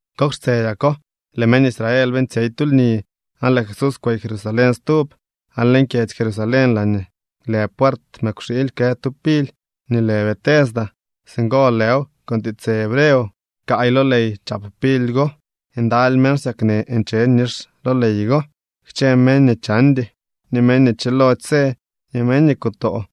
Kok xtsedyako lëë meñ Israel beeñtsyey tu lni aan lëë Jesús kwey Jerusalén stub. Aan leñ kyedzy Jerusalén laañee lë puert mëkwxiily kë tu pily nii lë Betesda. Singo lëw con tiitsë hebreo. Kaay lo ley chap pily go. Ndaly meñ xsyaknë nche nix lo ley go, kchë meñ nii chandy, ni meñ nii chilody së ni meñ nii kutoo.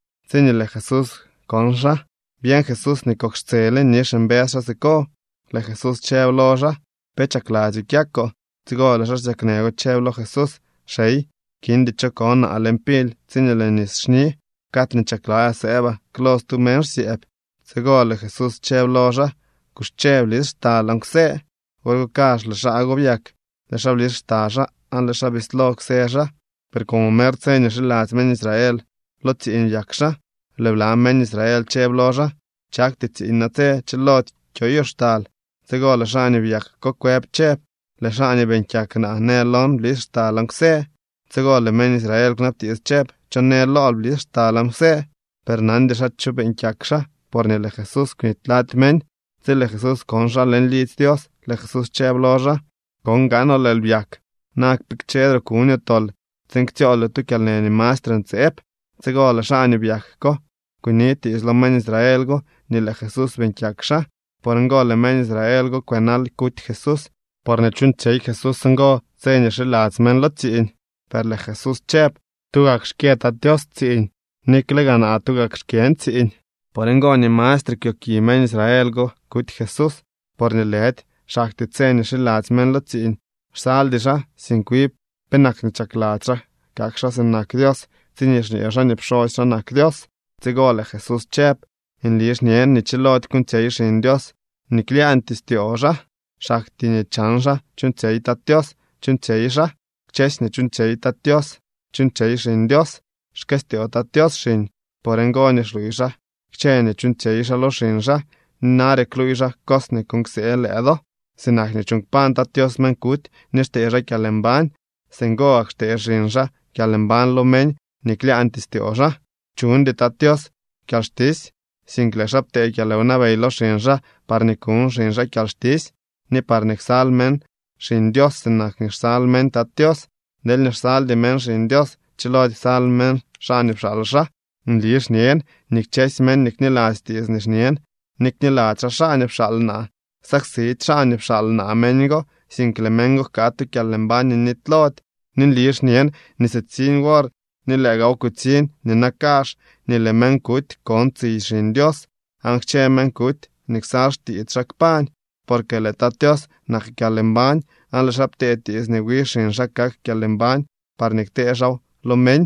Tsiñee lëë Jesús kon xaa, byeñ Jesús nii kok xtsele nix mbës xaa siko. Lëë Jesús chëb lo xaa: —¿Pe chakladzyoo kyakoo? Tsigo lëë xaa xsyaknë go chëb lo Jesús: —Xey, kindy cho ko naa leñ pily tsiñee lëë nis xni. Cad nii chakladzyaa sëëbaa, klol stu meñ xsyëëb. Tsigo lëë Jesús chëb lo xaa: —Kuxche, blis xtal aan kwsë. Wor go kazh lëë xaa go byak. Lëë xaa blis xta xaa aan lëë xaa bislo kwsë xaa. Per como mer tse nii xiladzy meñ Israel lo tsiiñ byak xaa, lëë bla meñ Israel chëb lo xaa: —Chakty tsiiñ natse. Chilody kyoyoo xtal. Tsigo lëë xaa nii byak ko kwëb chëb: —Lëë xaa nii beeñ kyak naa në lon: “Blis xtal aan kwsë.” Tsigo lëë meñ Israel kwnabtiits chëb: —¿Cho në lool: “Blis xtal aan kwsë”? Per nandy xaa cho beeñ kyak xaa, porñee lëë Jesús kwnity lady meñ. Tsi lëë Jesús kon xaa leñ lidzy Dios, lëë Jesús chëb lo xaa: —Kon gaanoo lëël byak. Na kpikchedroo kuñoo tol tsiin ktsyooldyoo tu kyalnë nii mastre ntseeb. Tsigo lëë xaa nii byak ko kunitiits lo meñ Israel go nii lëë Jesús beeñ kyak xaa. Por ngo lëë meñ Israel go kwënal kuty Jesús porñee chuuñtsyey Jesús ngo tse nii xiladzy meñ lo tsiiñ. Per lëë Jesús chëb: —Tugak xkyë Tat Tios tsiiñ, nikle gaa naa tugak xkyën tsiiñ. Por ngo nii mastre kwyoki meñ Israel go kuty Jesús, porñee lëdy xaktyee tse nii xiladzy meñ lo tsiiñ xsaldy xaa, sink wi penak nii chakladzy xaa kak xaa sinak Dios tsiñee xñee xaa nii pxosy xaa nak Dios. Tsigo lëë Jesús chëb: —Nli xñen nii chilody kuuñtsyey Xiñ Dios nii klyaañtyee styoo xaa. Xaktyee nii chan xaa chuuñtsyey Tat Tios chuuñtsyey xaa. Kchësy nii chuuñtsyey Tat Tios chuuñtsyey Xiñ Dios. Xkëstyoo Tat Tios xiñ. Por ngo nii xluuy xaa kchë nii chuuñtsyey xaa lo xiñ xaa, ni nare kluuy xaa cos nii kuuñ ksee lëë do. Sinak nii chuuñ kpañ Tat Tios meñ kuty nii xtee xaa kyalmbañ, singo gak xtee xiñ xaa kyalmbañ lo meñ nii klyaañtyee styoo xaa. Chuñdy Tat Tios kyalxtisy, sink lëë xaa ptee kyalwnabey lo xiñ xaa parñee kuñ xiñ xaa kyalxtisy, ni parñee ksal meñ Xiñ Dios sinak nii xsal meñ Tat Tios. Deelñee xsaldy meñ Xiñ Dios, chilody ksal meñ xaa nii pxaal xaa. ’Nli xñen nii kchësy meñ nii kniladzy tiits nii xñen ni kniladzy xaa xaa nii pxaal naa, ksaksidy xaa nii pxaal naa meñ go, sink lëë meñ go jkaa tu kyalmbañ nii nitylody. Ni nli xñen nii sitsiñ wor ni lëë gaaw kutsiñ nina kazh nii lëë meñ kuty kon tsiy Xiñ Dios, aan kchë meñ kuty nii ksal xtiits xaa kpañ. Porque lëë Tat Tios nak kyalmbañ, aan lëë xaa ptee tiits nii wi xiñ xaa kak kyalmbañ parñee ktee xaaw lo meñ.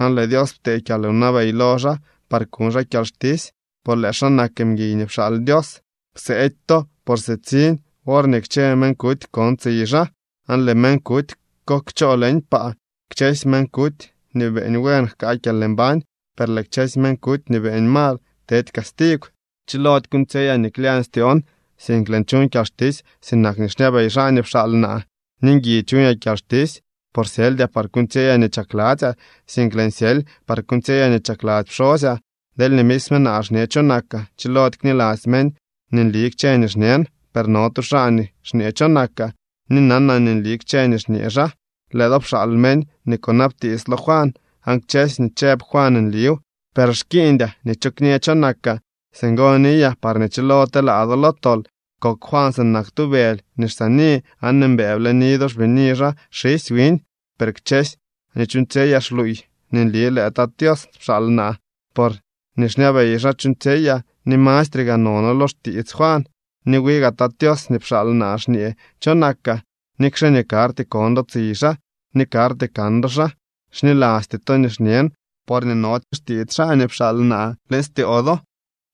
Aan lëë Dios ptee kyalwnabey lo xaa par kuñ xaa kyalxtisy, por lëë xaa nak mguiy nii pxaal Dios. Kseety to, por sitsiñ worñee kchë meñ kuty kon tsiy xaa, aan lëë meñ kuty ko kchoo leñ paa. Kchësy meñ kuty nii beeñ buen jkaa kyalmbañ, per lëë kchësy meñ kuty nii beeñ mal tedy castigw. ’Chilody kuuñtsyeyaa nii klyañ styoon, sink lëën chuñ kyalxtisy sinak nii xñabey xaa nii pxaal naa. Ni ngui chuñaa kyalxtisy, por syeldyaa par kuuñtsyeyaa nii chakladzyaa, sink lëën syely par kuuñtsyeyaa nii chakladzy pxosyaa. Deelñee misme naa xñe cho nakaa, chilody kniladzy meñ nii nli kchë nii xñen. Per no tu xaa nii xñee cho nakaa, ni nanaa nii nli kchë nii xñee xaa. Lëë do pxaal meñ nii kunabtiits lo Juan, aan kchësy nii chëb Juan nliw. Per xkiiñdyaa nii cho kñee cho nakaa. Singo niyaa parñee chilo telaa do lo tol. Kok Juan sinak tu bëly nii xsaani, aan mbëë bleni do xbini xaa xisy wiñ. Per kchësy nii chuuñtsyeyaa xluuy nii nli lëë Tat Tios pxaal naa, por nii xñabey xaa chuuñtsyeyaa, ni mastre gaa nono lo xtiits Juan. Ni wi gaa Tat Tios nii pxaal naa xñee cho nakaa, nikxe nii karty kon do tsiy xaa ni karty kan do xaa. Xnilasty to nii xñen porñee nody xtiits xaa nii pxaal naa leñ styoo do.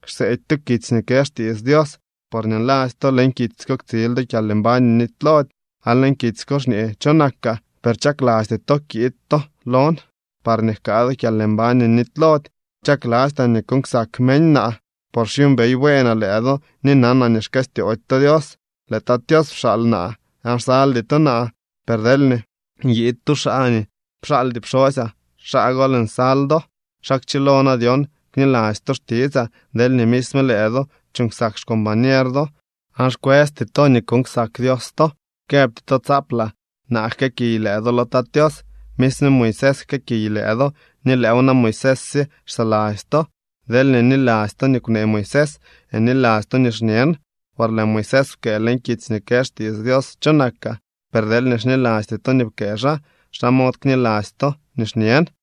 Xseedy to kitsy nii kë xtiits Dios porñee nladzy to leñ kitsy ko ktsil do kyalmbañ nii nitylody, aan leñ kitsy ko xñee cho nakaa. Per chaklasty to kiid to lon parñee jkaa do kyalmbañ nii nitylody. ’Chaklastyaa nii kuuñ ksak meñ naa, por xyuumbey bueenaa lëë do ni nanaa nii xkëstyoody to Dios. Lëë Tat Tios pxaal naa, aan xsaldy to naa, per deelñee nyiid tu xaa nii pxaaldy pxosyaa, xaa gol nsal do. ¿Xa kchilo na dyon kniladzy to xtitsaa deelñee misme lëë do chuuñ ksak xcombañer do, aan xkwësty to nii kuuñ ksak Dios to? Këbty to tsaaplaa naa jkëëkiy lëë do lo Tat Tios. Misme Moisés xkëëkiy lëë do, ni lëëw na Moisés sye xsaladzy to. Deelñee niladzy to nii kwnee Moisés, niladzy to nii xñen, por lëë Moisés pkëë leñ kitsy nii kë xtiits Dios cho nakaa. Per deelñee xnilasty to nii pkëë xaa, ¿xa mod kniladzy to nii xñen?